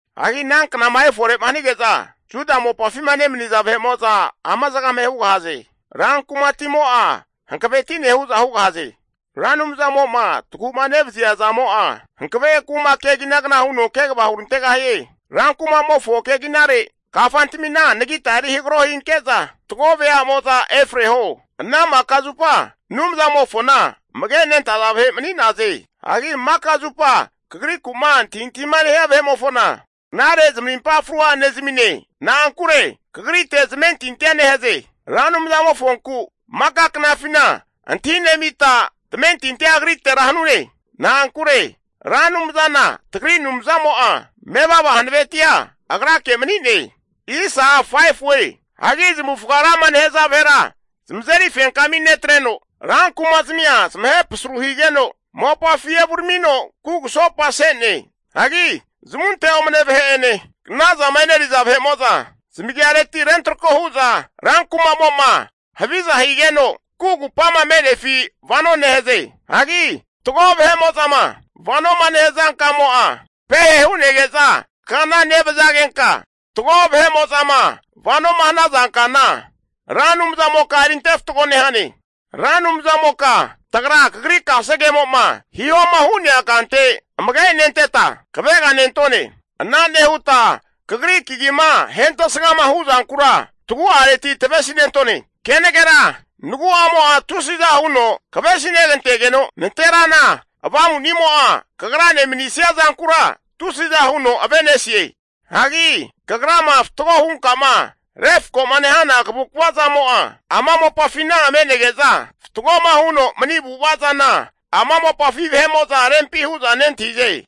Hagi ana knama efore'ma hanige'za, Juda mopafima nemaniza vahe'mo'za ama zagame hugahaze. Rankumatimo'a hankaveti'ne hu'za hugahaze. Ra Anumzamo'ma tagu'ma nevazia zamo'a hankave kuma keginagna huno kegava hurantegahie. Rankumamofo keginare kafantamina anagita eri hagaro hinke'za, fatgo veamo'za efreho. Ana maka zupa Anumzamofona amagenentaza vahe mani'naze. Hagi maka zupa Kagrikuma antahintahima nehia vahe'mofona, knare zamarimpa frua nezamine. Na'ankure Kagrite zamentintia nehaze. Ra Anumzamofonku maka knafina antahi nemita tamentintia Agritera hanune. Na'ankure Ra Anumzana tagri Ra Anumzamo'a mevava hanavetia Agrake mani'ne. Hagi zamavufaga rama nehaza vahera zamazeri fenkami netreno, rankumazmia ahe pasru higeno mopafi evuramino kugusopase'ne. Hagi zamunte omne'ne vahe'ene, knazama e'neriza vahe'mo'za, zamagiareti rentrako hu'za rankumamo'ma haviza higeno kugupama me'nefina vano nehaze. Hagi fatgo vahe'mo'zama vanoma nehaza kamo'a pehe hu'nege'za kana nevazagenka, fatgo vahe'mo'zama vanoma hanaza kana Ra Anumzamoka erinte fatgo nehane. Ra Anumzamoka tagra Kagri kasegemo'ma hihoma hu'nea kante amage nenteta kavega nentone. Ana nehuta Kagri kagima ahentesgama huzankura tagu'areti tavesinentone. Kenagera nagu'amo'a tusiza huno kavesinegantegeno, nanterana avamunimo'a kagrane manisia zankura tusiza huno ave'nesie. Hagi kagrama fatgo hunka'ma refko'ma nehana kavukvazamo'a ama mopafina me'nege'za, fatgoma huno mani avu'ava zana ama mopafi vahe'mo'za rempi hu'za nentahize.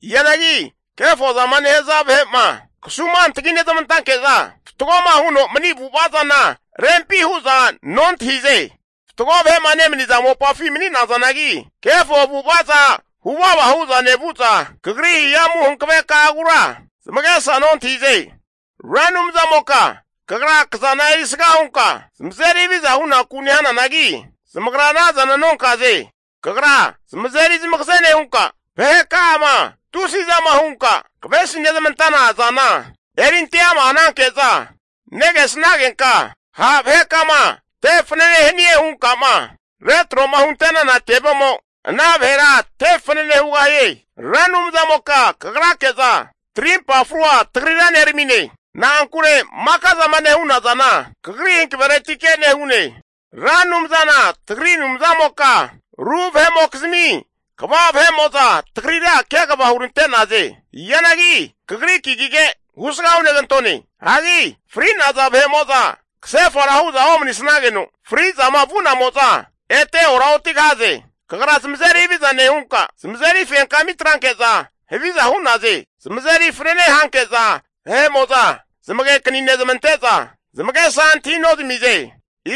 Hianagi kefozama nehaza vahe'ma kasumantagi nezmantanke'za, fatgoma huno mani avu'ava zana rempi hu'za nontahize. Fatgo vahe'ma nemaniza mopafi mani'nazanagi, kefo avu'avaza huvava hu'za nevu'za, Kagri hihamu hankaveka'agura zamagesa nontahize. Ra Anumzamoka Kagra kazana erisga hunka zamazeri haviza hunaku nehananagi, zamagra anazana nonkaze. Kagra zamazeri zamagaze nehunka, vaheka'ama tusizama hunka kavesi nezmantana zana erinte ama hananke'za negesnagenka, ha' vahekama te fanane hanie hunkama retro'ma hunte'nana tevemo ana vahera te fanane hugahie. Ra Anumzamoka Kagrake'za tarimpa frua tagrira neramine. Na'ankure maka zama nehuna zana Kagri hankaveretike nehune. Ra Anumzana tagri Anumzamoka, ru vahe'mokizmi kva vahe'mo'za tagrira kegava hurante'naze. Hianagi Kagri kagige husga hunegantone. Hagi fri'naza vahe'mo'za kasefara hu'za omanisageno, fri'zama vu'namo'za ete oraotigahaze. Kagra zamazeri haviza nehunka, zamazeri fenkami atranke'za haviza hu'naze. Zamazeri fanene hanke'za vahe'mo'za zamagekani nezmante'za, zamagesa antahi nozamize.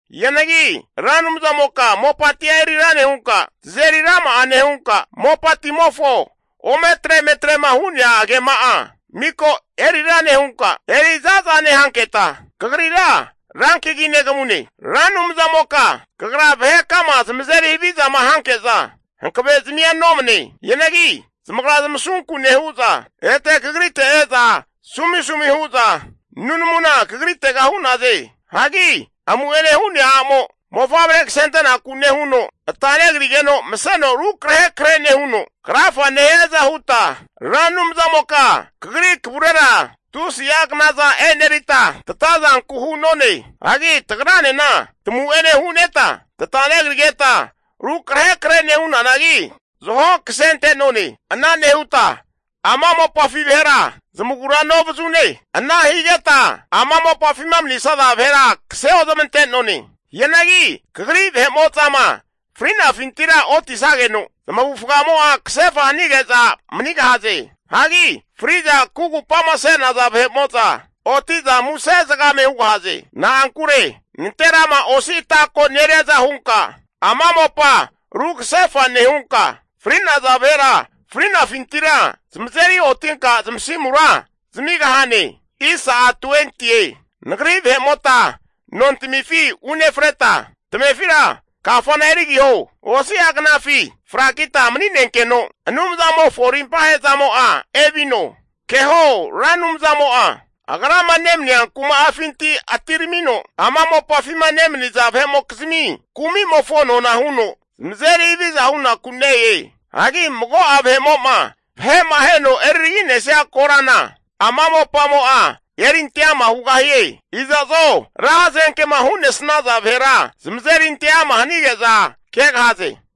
Hianagi Ra Anumzamoka mopatia eri ra nehunka, tazeri rama'a nehunka, mopatimofo ometre emetrema hu'nea agema'a miko erira nehunka eri za'za nehanketa, Kagrira rankagi negamune. Ra Anumzamoka, kagra vahekama zamazeri havizama hanke'za hankavezamia nomane. Hianagi zamagra zamasunku nehu'za, ete kagrite e'za sumisumi hu'za nunamuna Kagritega hu'naze. Hagi amu'ene hu'nea a'mo mofavre kasente'naku nehuno ata negrigeno maseno rukrahe krahe nehuno krafa nehiaza huta, Ra Anumzamoka kagri kavurera tusi'a knaza enerita tatazanku hu'none. Hagi tagranena tamu'ene hu'neta tata negrigeta rukrahe krahe nehunanagi, zaho kasente'none. Ana nehuta ama mopafi vahera zamagura novazune. Ana higeta ama mopafima manisaza vahera kase ozmante'none. Hianagi Kagri vahe'mo'zama fri'nafintira oti'sageno, zamavufagamo'a kasefa hanige'za manigahaze. Hagi fri'za kugupama se'naza vahe'mo'za oti'za muse zagame hugahaze. Na'ankure nanterama osi ata ko neriaza hunka ama mopa ru kasefa nehunka, fri'naza vahera fri'nafintira zamazeri otinka zamasimura zamigahane. Nagri vahe'mota nontamifi unefreta, tamefira kafana erigiho. Osi'a knafi frakita mani'nenkeno Anumzamofo arimpa ahe'zamo'a evino. Keho Ra Anumzamo'a agrama nemania kuma'afinti atiramino, ama mopafima nemaniza vahe'mokizmi kumi'mofo nona huno zamazeri haviza hunaku ne-e. Hagi mago'a vahe'mo'ma vahe'ma aheno eriragi'nesnia korana ama mopamo'a erinte ama hugahie. Iza'zo ra hazenkema hu'nesnaza vahera zamazeri ante ama hanige'za kegahaze.